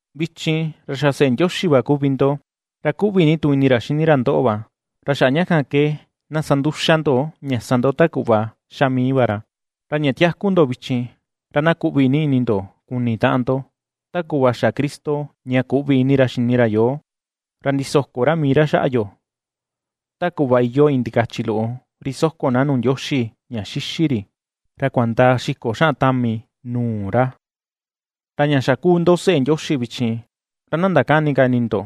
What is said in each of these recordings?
Vichin, ra xa seꞌe Ndioxi va kuvi ndo, ra kuꞌvi ni tu ini ra xini ra ndoꞌo va, ra xaꞌa ña kan ke, na sa nduxa ndo ña sa ndo ta kuꞌva xa mii va ra. Ra ña tiaku ndo vichin, ra na kuꞌvi ni ini ndo kuni taꞌan ndo, ta kuꞌva xa Cristo ña kuꞌvi ini ra xini ra yoo, ra ndisoko ra mii ra xaꞌa yo, ta kuꞌva iyoo iin ndikachi loꞌo ri soko na nuu Ndioxi ña xixi ri, ra kuandaa xiko xaꞌan tami nuu ra. Ra ña xa ^kuu ndo seꞌe Ndioxi vichin, ra na ndakäni ka ini ndo,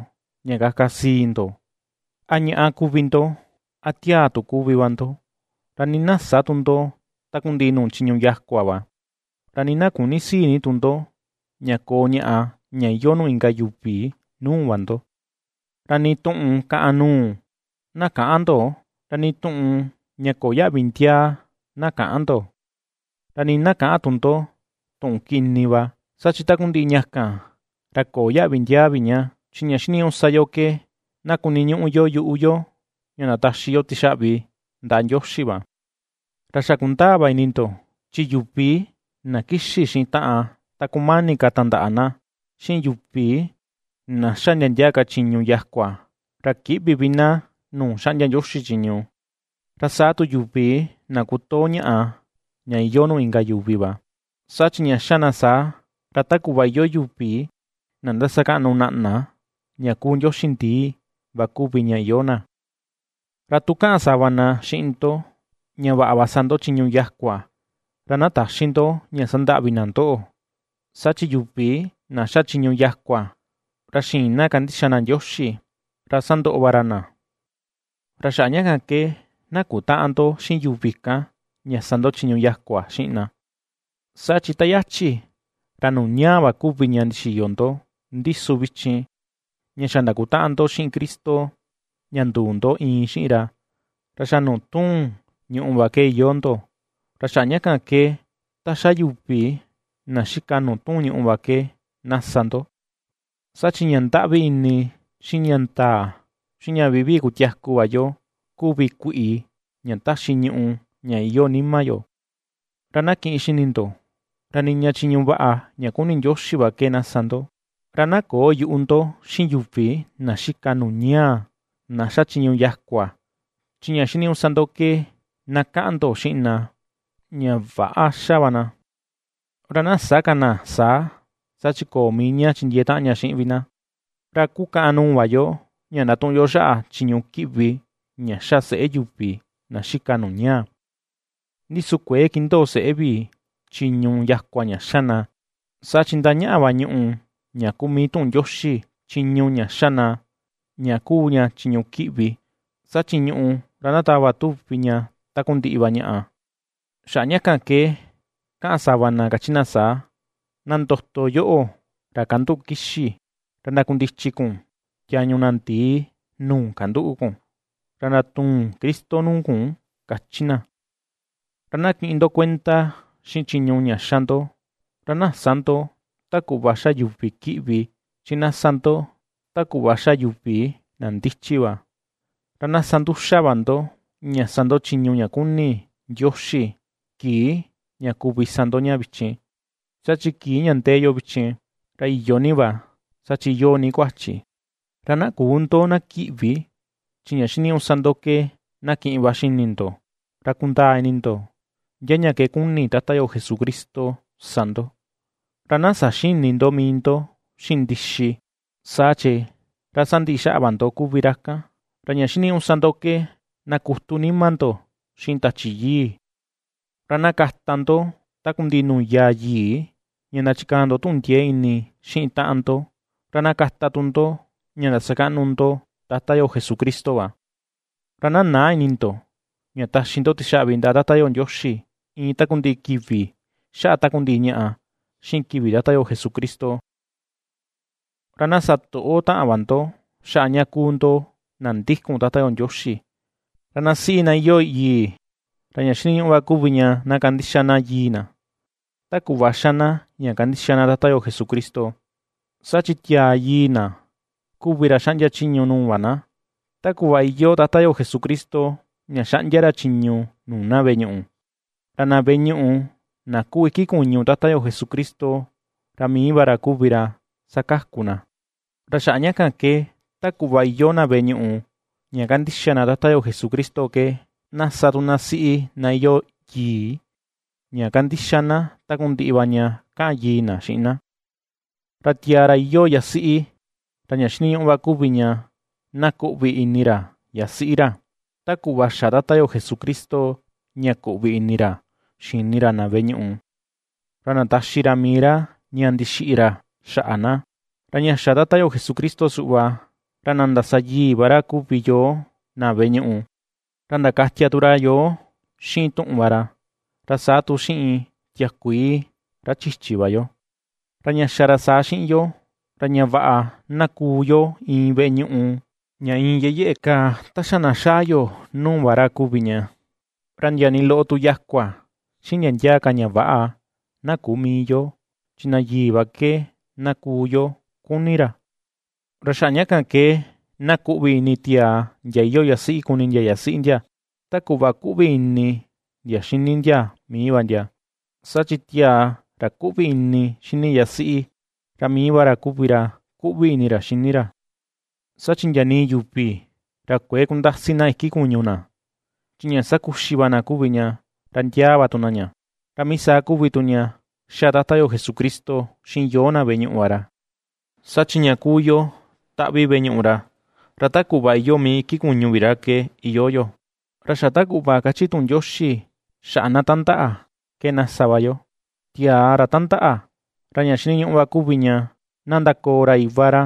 ña kaka sii ndo, a ñaꞌa kuvi ndo a tiaa tu kuvi va ndo, ra nii na sä tu ndo takundiꞌi nuu chiñu yakua va, ra nii na küni sii ni tu ndo ña koo ñaꞌa ña iyoo nuu inka yuvi nuu va ndo. Ra nii tuꞌun kàꞌàn nuu, na käꞌan ndo, ra nii tuꞌun ña köo yaꞌvi ndiaa na käꞌan ndo, ra nii na käꞌan tu ndo tuꞌun kini va, saa chi takundiꞌi ña kan, ra köo yaꞌvi ndiaa vi ña; chi ña xiniñuꞌu sa yo ke, na kuniñuꞌu yo yuꞌu yo ña ndataxi yo tixaꞌvi ndaꞌa Ndioxi va. Ra xa kundaa va ini ndo, chi yuvi na kixi xiꞌin taꞌan ta kumani ka tandaꞌa na, xiꞌin yuvi na ^xa ndia ndia ka chiñu yakua, ra kïꞌvi vi na nuu xaꞌndia Ndioxi chiñu, ra saa tu yuvi na kutoo ñaꞌa ña iyoo nuu inka yuvi va, saa chi ña xa na saa, ra ta kuꞌva iyoo yuvi na ndasakaꞌnu naꞌna ña kuu ndioxi ndii va kuvi ña iyoo na. Ra tu kaꞌan sava na xiꞌin ndo ña vaꞌa va sa ndo chiñu yakua, ra na täxi ndo ña sandaꞌvi na ndo, saa chi yuvi na ^xa chiñu yakua ra xïin na kandixa na Ndioxi, ra ^sandoꞌo va ra na. Ra xaꞌa ña kan ke, na kutäꞌan ndo xiꞌin yuvi kan ña sa ndo chiñu yakua xiꞌin na. Saa chi ta yachi, ra nuu ñaa va kuvi ña ndixiyo ndo, ndi su vichin ña xa ndakutaꞌan ndo xiꞌin Cristo ña nduu ndo iin xiꞌin ra, ra xa nuu tuun ñuꞌu va ke iyoo ndo. Ra xaꞌa ña kan ke ta ^xa yuvi na xika nuu tuun ñuꞌu va ke na sa ndo. (Saa chi ña ndaꞌvi ini, xiꞌin ña ndaa, xiꞌin ña vivii kutiaku va yo kuvi kuiꞌi, ña taxi Tachi Yii ña iyoo nima yo). Ra na kiꞌin xini ndo, ra niña chiñu vaꞌa, ña kuni Ndioxi va ke na sa ndo. Ra na köo yuꞌu ndo xiꞌin yuvi na xika nuu ñaa, na ^xa chiñu yakua; chi ña xiniñuꞌu sa ndo ke, na kaꞌan ndo xiꞌin na ña väꞌa ^xa va na, ra na sä ka na saa, saa chi köo mii ña chindiee taꞌan ña xiꞌin vi na. Ra ^kukaꞌan nuu va yo, ña ndatuꞌun yo xaꞌa chiñu kiꞌvi ña xa seꞌé yuvi na xika nuu ñaa. Ndi su kuëe kindoo seꞌé vi chiñu yakua ña xa na, saa chi ndañaꞌa va ñùꞌù ña kuu mii tuꞌun Ndioxi chiñu ña xa na ña kuu ña chiñu kiꞌvi, saa chi ñuꞌù, ra ndatava tuvi ña takundiꞌi va ñaꞌa. Xaꞌa ña kan ke kaꞌan sava na, kachi ña saa: Na ndoto yoꞌo, ra kanduꞌu kixi; ra ndakundichi kun tiañu na ndii nuu kanduꞌu kun, ra ndatuun Cristo nuu kun, ^kachi na. Ra na kiꞌin ndo kuenda xiꞌin chiñu ña xa ndo. Ra na sä ndo ta kuꞌva xa yuvi kiꞌvi, chi na ^sa ndo, ta kuꞌva ^xa yuvi na ndichi va. Ra na sa nduxa va ndo, ña sa ndo chiñu ña kuni Ndioxi kii ña kuvi sa ndo ña vichin, saa chi kii ña ndee yo vichin, ra iyo ni va, saa chi iyoo ni kuachi. Ra na küu ndo na kiꞌvi, chi ña xiniñuꞌu sa ndo ke na kiꞌin va xini ndo, ra kundaa ini ndo ndia ña ke kuni Tata yo Jesucristo sa ndo. Ra na saxïni ndo mii ndo xiꞌin ndixi, saa chi, ra sandiꞌi xaꞌa va ndo kuvi ra kan; ra ña xiniñuꞌu sa ndo ke na kutu nima ndo xiꞌin Tachi Yii va. Ra na kata ndo takundiꞌi nuu yaa yii, ña ndachikaa ndo tuꞌun ndiee ini xiꞌin taꞌan ndo, ra na kata tu ndo ña ndasakaꞌnu ndo Tata yo Jesucristo va. Ra na näa ini ndo ña taxi ndo tixaꞌvi ndaꞌa Tata yo Ndioxi, iin takundiꞌi kivi xaꞌa takundiꞌi ñaꞌa, xiꞌin kivi Tata yo Jesucristo. Ra na sa toꞌo taꞌan va ndo xaꞌa ña kuu ndo na ndikun Tata yo Ndioxi. Ra na siꞌi, na iyoo yii, ra ña xiniñuꞌu va kuvi ña na kandixa na yii na, ta kuꞌva xa na ña kandixa na Tata yo Jesucristo. Saa chi tiaa yii na, kuvi ra xaꞌndia chiñu nuu va na, ta kuꞌva iyoo Tata yo Jesucristo, ña xaꞌndia ra chiñu nuu na veꞌe ñuꞌu. Ra na veꞌe ñuꞌu na kuu iki kuñu Tata yo Jesucristo, ra mii va ra kuvi ra ^sakaku na. Ra xaꞌa ña kan ke, ta kuꞌva iyoo na veꞌe ñuꞌu ña kandixa na Tata yo Jesucristo ke, na sa tu na siꞌi na iyoo yii ña kandixa na takundiꞌi va ña kaꞌan yii na xiꞌin na. Ra tiaa ra iyoo yasiꞌi, ra ña xiniñuꞌu va kuvi ña na kuꞌvi ini ra yasiꞌi ra, ta kuꞌva xa Tata yo Jesucristo ña kuꞌvi ini ra xini ra na veꞌe ñuꞌu, ra ndataxi ra mii ra ña ndixiꞌi ra xaꞌa na. Ra ña xa Tata yo Jesucristo suꞌva, ra na ndasa yii va ra kuvi yoo na veꞌe ñuꞌu, ra ndakatia tu ra yoo xiꞌin tuꞌun va ra, ra saa tu xiꞌin tiakuii, ra chichi va yo. Ra ña xa ra saa xiꞌin yo, ra ña vaꞌa na kuu yo iin veꞌe ñuꞌu ña iin yeꞌe yeꞌe kaa ta xa na xaa yo nuu va ra kuvi ña, ra ndia ni loꞌo tu yakua, xiꞌin ndia ndia ka ña väꞌa na küu mii yo, chi na yii va ke na kuu yo kuni ra. Ra xaꞌa ña kan ke, na kuꞌvi ini tiaa ndia iyoo yasiꞌi kuni ndia yasiꞌi ndia, ta kuꞌva kuꞌvi ini ndia xini ndia mii va ndia. Saa chi tiaa ra kuꞌvi ini xini yasiꞌi, ra mii va ra kuvi ra kuꞌvi ini ra xini ra. Saa chi ndia nii yuvi, ra kuëe kundasi na iki kuñu na, chi ña sakuxi va na kuvi ña, ra ndiaa va tu na ña; ra mii saa kuvi tu ña ^xa Tata yo Jesucristo xiꞌin yoo na veꞌe ñuꞌu va ra. Saa chi ña kuu yo taꞌvi veꞌe ñuꞌu ra, ra ta kuꞌva iyoo mii iki kuñu vi ra ke, iyoo yo. Ra xa ta kuꞌva kachi tuꞌun Ndioxi xaꞌa na tandaꞌa, ke na sa va yo: “Tiaa ra tandaꞌa, ra ña xiniñuꞌu va kuvi ña na ndakoo ra iva ra,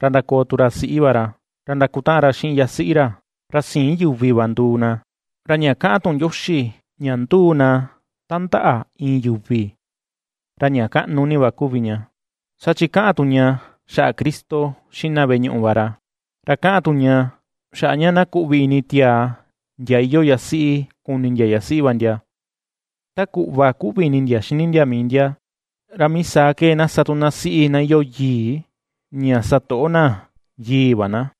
ra ndakoo tu ra siꞌi va ra, ra ndakutaꞌan ra xiꞌin yasiꞌi ra, ra siin yuvi va nduu na.” Ra ña kaꞌan tuꞌun Ndioxi ña ^nduu na tandaꞌa iin yuvi, ra ña kaꞌnu ni va kuvi ña, saa chi kaꞌan tu ña xaꞌa Cristo xiꞌin na veꞌe ñuꞌu va ra. Ra kaꞌan tu ña, xaꞌa ña na kuꞌvi ini tiaa ndia iyoo yasiꞌi kuni ndia yasiꞌi va ndia, ta kuꞌva kuꞌvi ini ndia xini ndia mii ndia, ra mii saa ke na sa tu siꞌi na iyoo yii, ña sa toꞌo na yii va na.